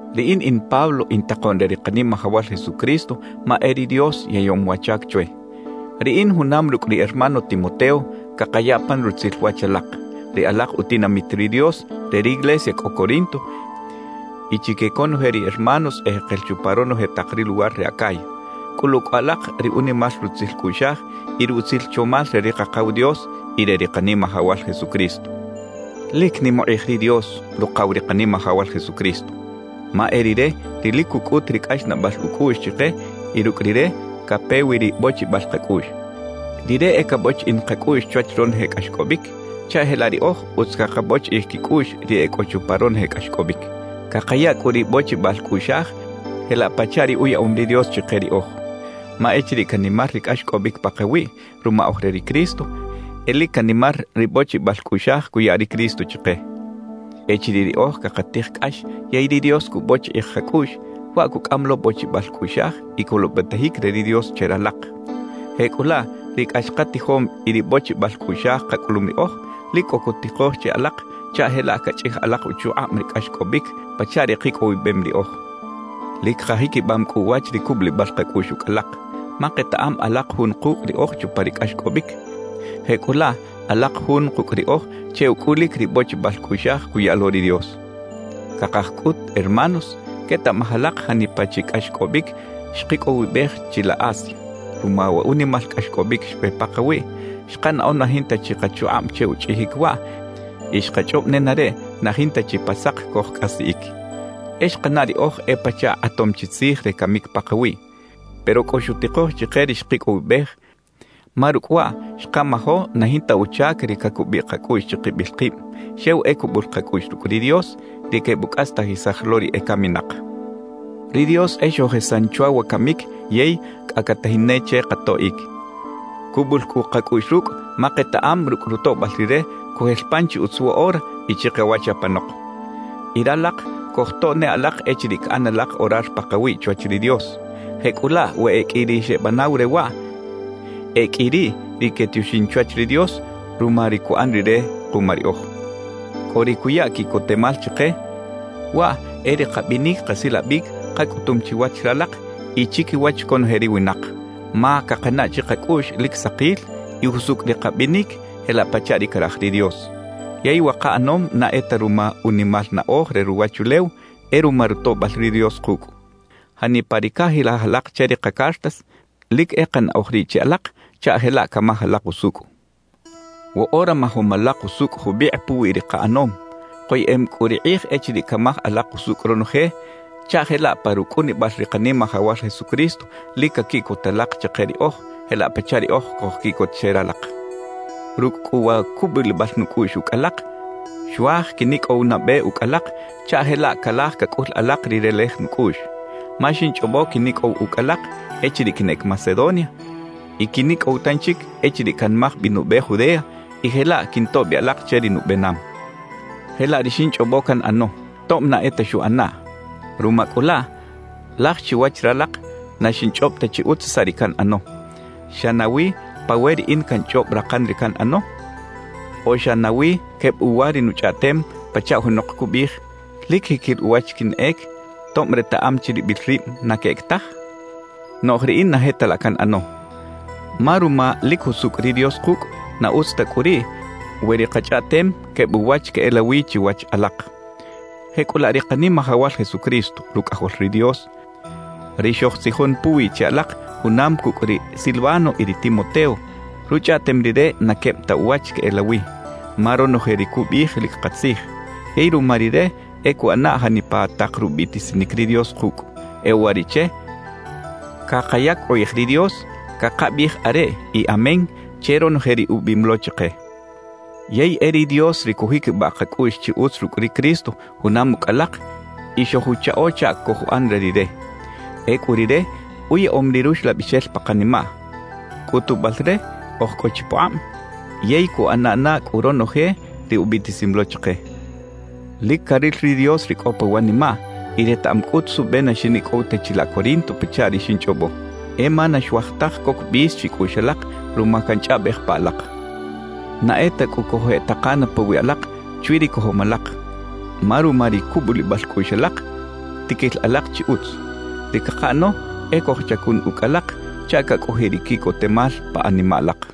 Riꞌin in Pablo in takoꞌn re ri Kanimajawal Jesucristo ma e ri Dios yaꞌyom wa chac chwe. Riꞌin junam rucꞌ ri hermano Timoteo cakaya pan rutzil wach alak, ri alak utinamit ri Dios re riglesia cꞌo Corinto, y chique conoje ri hermanos ejekel chupa ronoje tak ri luwar re Acaya. Cꞌulu cꞌu alak ri unimal rutzil cꞌuꞌxaj y ri utzil chomal re ri Kakaw Dios y re ri Kanimajawal Jesucristo. ¡Lic nim ukꞌij ri Dios, Rukaw ri Kanimajawal Jesucristo! Ma e Rire ri lic cucꞌut ri cꞌaxnaꞌbal ucꞌuꞌx chike y rucꞌ Rire cape wi ri bochibal kacꞌuꞌx. Rire e cabochiꞌin kacꞌuꞌx chwach ronoje cꞌaxcꞌobic, chaꞌ jelaꞌ riꞌoj utz cakabochiꞌij quicꞌuꞌx ri e cꞌo chupa ronoje cꞌaxcꞌobic. Cakaya cꞌu ri bochibal cꞌuꞌxaj jelaꞌ pachaꞌ ri uyaꞌom ri Dios chike riꞌoj. Ma echiriꞌ canimar ri cꞌaxcꞌobic pakawiꞌ ruma oj re ri Cristo, e lic canimar ri bochibal cꞌuꞌxaj cuya ri Cristo chike. Echiriꞌ riꞌoj cakatij cꞌax yey ri Dios cubochiꞌij kacꞌuꞌx, waꞌ cucꞌam lo bochibal cꞌuꞌxaj y colobetajic re ri Dios che ralak. Jecꞌulaꞌ ri cꞌax katijom y ri bochibal cꞌuꞌxaj kacꞌulum riꞌoj, lic cꞌo cutikoj che alak chaꞌ jelaꞌ cachꞌij alak uchukꞌab ri cꞌaxcꞌobic pachaꞌ ri kicꞌowibem riꞌoj. Lic kajiquibam cꞌu uwach ri cubulibal kacꞌuꞌx ucꞌ alak. Ma ketaꞌam alak jun kucꞌ riꞌoj chupa ri cꞌaxcꞌobic, jecꞌulaꞌ alak jun kucꞌ riꞌoj che ucꞌulic ri bochibal cꞌuꞌxaj cuya lo ri Dios. Cakaj cꞌut, hermanos, quetaꞌmaj alak janipa chi cꞌaxcꞌobic xkicꞌowibej chilaꞌ Asia. Ruma wa unimal cꞌaxcꞌobic xpe pakawiꞌ, xkanaꞌo na jinta chi kachukꞌab che uchꞌijic waꞌ y xkachꞌob nenareꞌ na jinta chi pa sak cojcꞌasiꞌic. E xkanaꞌ riꞌoj e pachaꞌ kꞌatom chi tzij re camic pakawiꞌ. Pero cꞌo xutikoj chike ri xkicꞌowibej, ma rucꞌ waꞌ xkamajo na jinta uchac ri cacubiꞌ kacꞌuꞌx chikibil kib; xew e cubul kacꞌuꞌx rucꞌ ri Dios, ri quebucꞌastajisaj lo ri ecaminak. Ri Dios e xojesan chwa wa camic yey cꞌa catajin ne che katoꞌic. Cubul cꞌu kacꞌuꞌx rucꞌ, ma ketaꞌam rucꞌ rutoꞌbal Rire cojel pan chi utz woꞌora y chikawach apanok. Y ralak cojtoꞌ ne alak echiriꞌ caꞌan alak orar pakawiꞌ chwach ri Dios. Jecꞌulaꞌ we e qꞌui ri xebanaw re waꞌ, e qꞌui riꞌ ri quetioxin chwach ri Dios ruma ri cuꞌan Rire kuma riꞌoj. Cꞌo ri cuya quiꞌcotemal chike; waꞌ e ri kabinic kasilabic kacꞌutum chiwach ralak y chiquiwach conoje ri winak, ma cakanaꞌ chikacꞌuꞌx lic sakil y jusucꞌ ri kabinic jelaꞌ pachaꞌ ri caraj ri Dios. Yey wa kaꞌanom na e ta ruma unimal naꞌoj re ruwachulew; e ruma rutoꞌbal ri Dios kucꞌ. Janipa ri cajilaj alak che ri kacartas, lic e kanaꞌoj riꞌ che alak chaꞌ jelaꞌ camaj alak usucꞌ. Woꞌora majom alak usucꞌ jubikꞌ puwi ri kaꞌanom; koyeꞌem cꞌu ri kꞌij echiriꞌ camaj alak usucꞌ ronoje, chaꞌ jelaꞌ pa rucꞌunibal ri Kanimajawal Jesucristo lic caquiꞌcot alak chike riꞌoj, jelaꞌ pachaꞌ riꞌoj cojquiꞌcot che ralak. Rucꞌ cꞌu wa cubulibal nucꞌuꞌx ucꞌ alak, xuaj quinicꞌow nabe ucꞌ alak chaꞌ jelaꞌ calaj cacꞌul alak ri relej nucꞌuꞌx, ma xinchꞌobo quinicꞌow ucꞌ alak echiriꞌ quinꞌec Macedonia y quinicꞌow tanchic echiriꞌ canmaj bi nube Judea y jelaꞌ quintoꞌ bi alak che ri nubenam. Jelaꞌ ri xinchꞌobo canꞌano, tob na e ta xuꞌanaꞌ. Ruma cꞌu laꞌ, laj chiwach ralak na xinchꞌob ta chi utz saꞌ ri canꞌano. ¿Xa nawi pa we riꞌin canchꞌob rakan ri canꞌano? ¿O xa nawi queb uwa ri nuchꞌaꞌtem, pachaꞌ junok cubiꞌij: «Lic jiquil uwach quinꞌec,» tob retaꞌam chiribil rib na queꞌec taj? Noꞌj riꞌin na je ta laꞌ canꞌano. Ma ruma lic jusucꞌ ri Dios kucꞌ, na utz ta cꞌu riꞌ we ri kachꞌaꞌtem queb uwach queꞌelawi chiwach alak. Jecꞌulaꞌ ri Kanimajawal Jesucristo, Rucꞌajol ri Dios, ri xojtzijon puwiꞌ che alak junam cucꞌ ri Silvano y ri Timoteo, ruchꞌaꞌtem Rire na queb ta uwach queꞌelawi; ma ronoje ri cubiꞌij lic katzij. Yey ruma Rire e cuꞌana janipa tak rubiꞌtisinic ri Dios kucꞌ. E uwariꞌche cakayac ukꞌij ri Dios, cakabiꞌij «Areꞌ» y «Amén» che ronoje ri ubiꞌim lo chike. Yey e ri Dios ri cujiquibaꞌ kacꞌuꞌx chi utz rucꞌ ri Cristo junam ucꞌ alak y xojuchaꞌo chaꞌ cojuꞌan re Rire. Ecꞌu Rire uyaꞌom ri Ruxlabixel pa kanimaꞌ, cꞌutubal re oj cꞌo chi pukꞌab yey cuꞌana na cꞌu ronoje ri ubiꞌtisim lo chike. Lic caril ri Dios ri cꞌo pa wanimaꞌ y retaꞌam cꞌut suꞌbe na xinicꞌow ta chilaꞌ Corinto pachaꞌ ri xinchꞌobo. E ma na xuaj taj coc bis chicꞌuꞌx alak ruma canchꞌaꞌbej pa alak. Na e ta cꞌu cojeꞌtakana pawiꞌ alak chwi ri cojom alak; ma ruma ri cubulibal cꞌuꞌx alak, tiquil alak chi utz. Ri cakaꞌano e cojchacun ucꞌ alak chaꞌ cacꞌojiꞌ ri quiꞌcotemal pa animaꞌ alak.